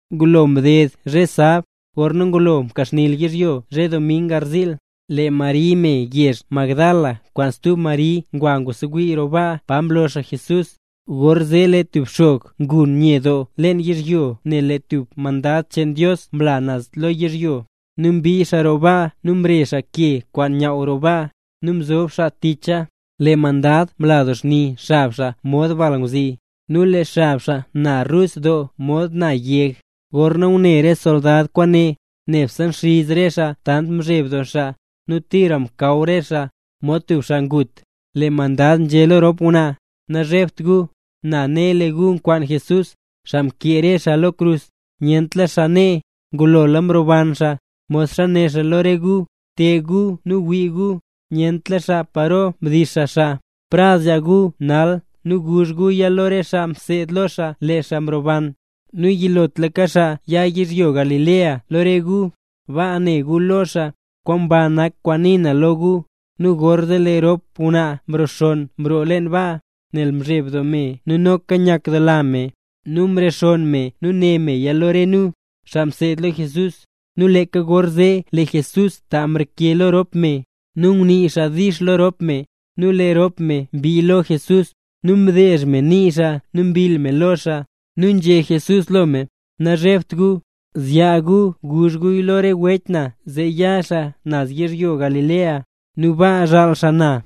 Ngulo mded zhe sab, gorna ngulo mkaxni yizhyo zhe dming garziil, lee Mari me yezh Magdala kwaan stub Mari ngwa ngusewii roo baa pa mlo xaa Jesús. Gorzee lee tub xog mgun nye doo leen yizhyo nel lee tub mandad cheen Dios mla naz lo yizhyo, nu mbii xaa roo baa nu mre xaa ke kwaan nyaww roo baa, nu mzob xaa ticha. Lee mandad mla doo xni xab xaa mod balngwzi, nu lee xab xaa na rus doo mod na yeg. Gorna ngune re soldad kwaane, nebse nxiz re xaa tant mzheb doo xaa, nu tira mkaw re xaa, mod tub xaa ngut. Lee mandad nzhé lo rop ngwnaa: —Nazhebt gu. Na ne lee gu nzekwaan Jesús, xaa mkee re xaa lo krus. Nyentla xaa nee, ngulola mroban xaa, modxa né xaa lo re gu. Te gu nu wii gu, nyentla xaa paro mdix xaa xaa. Prad zyaa gu nal nu guzh guya lo re xaa mseed lo xaa, lee xaa mrobanla. Nu yilotlaka xaa ya yizhyo Galilea lo re gu. Baa ne gu lo xaa. Kwaan ba nak kwaan nii na lo gu. Nu gorzee lee rop ngwnaa mroo xonn mroo leen baa, nel mzheb doo me nu noka nyakdoola me. Nu mrexonn me né meya lo re nu, xaa mseed lo Jesús. Nu leeka gorzee lee Jesús ta mreke lo rop me. Nu ngunii xaa “dix” lo rop me. Nu lee rop me mbii lo Jesús, nu mdeezh me nii xaa nu mbill me lo xaa. Nu nzhé Jesús lo me: —Nazhebt gu. Zyaa gu nu guzh gu lo re wech na zee ya xaa naz yizhyo Galilea, nu baa zhaal xaa na.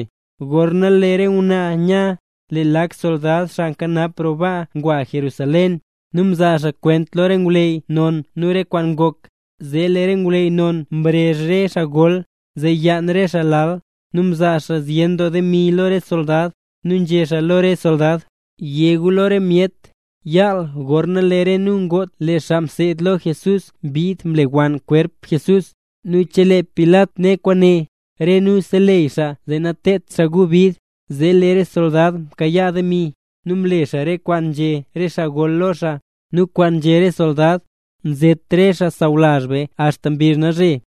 Gorna lee re ngwnaa nya, lee lak soldad xaa nkanap roo baa ngwa Jerusalén, nu mzaa xaa kwent lo re ngwleyy non re kwaan ngok. Zee lee re ngwleyy non mrezh re xaa gol, zee yaan re xaa lal. Nu mzaa xaa zyen doo demi lo re soldad, nu nzhé xaa lo re soldad: —Yé gu lo re myet: “Yaal, gorna lee re nu ngot, lee re xaa mseed lo Jesús mbid mlewann xkwerp Jesús”. Nu chelee Pilat ne kwaane, re nu seleyy xaa zee nateedt xaa gu bid. Zee lee re soldad mkayaa re demi, nu mle xaa re kwaan nzhé re xaa gol lo xaa. Nu kwaan nzhé re soldad, nzet re xaa sawlazh be axta mbizh nalzhe.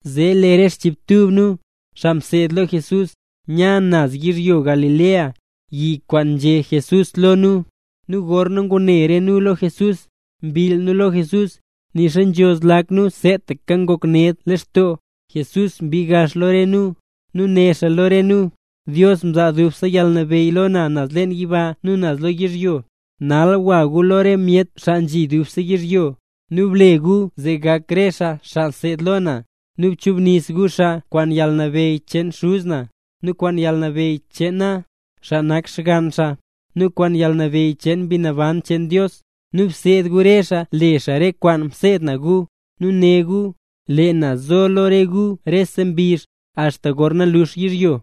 Zee lee re chiibtub nu, xaa mseed lo Jesús, nya naz yizhyo Galilea, yi kwaan nzhé Jesús lo nu. Nu gorna ngune re nu lo Jesús, mbill nu lo Jesús, nixa nzho lak nu seetaka ngok ned lextoo. Jesús mbii gax lo re nu, nu né xaa lo re nu: —Dios mzaa dubse yalnabeyy lo na naz leen yiba nu naz lo yizhyo ne. Nal gwa gu lo rese myet, xaa nzhi dubse lo yizhyo, nu ble gu zee gak re xaa xaa seed lo na, nu bchubnis gu xaa kwaan yalnabeyy cheen Xuz na, nu kwaan yalnabeyy cheen na, xaa nak xgann Xaa, nu kwaan yalnabeyy cheen Mbi Naban cheen Dios. Nu bseed gu re xaa le xaa re kwaan mseed na gu. ¡Nu ne gu, lee na zo lo re gu rese mbizh, axta gorna lux yizhyo!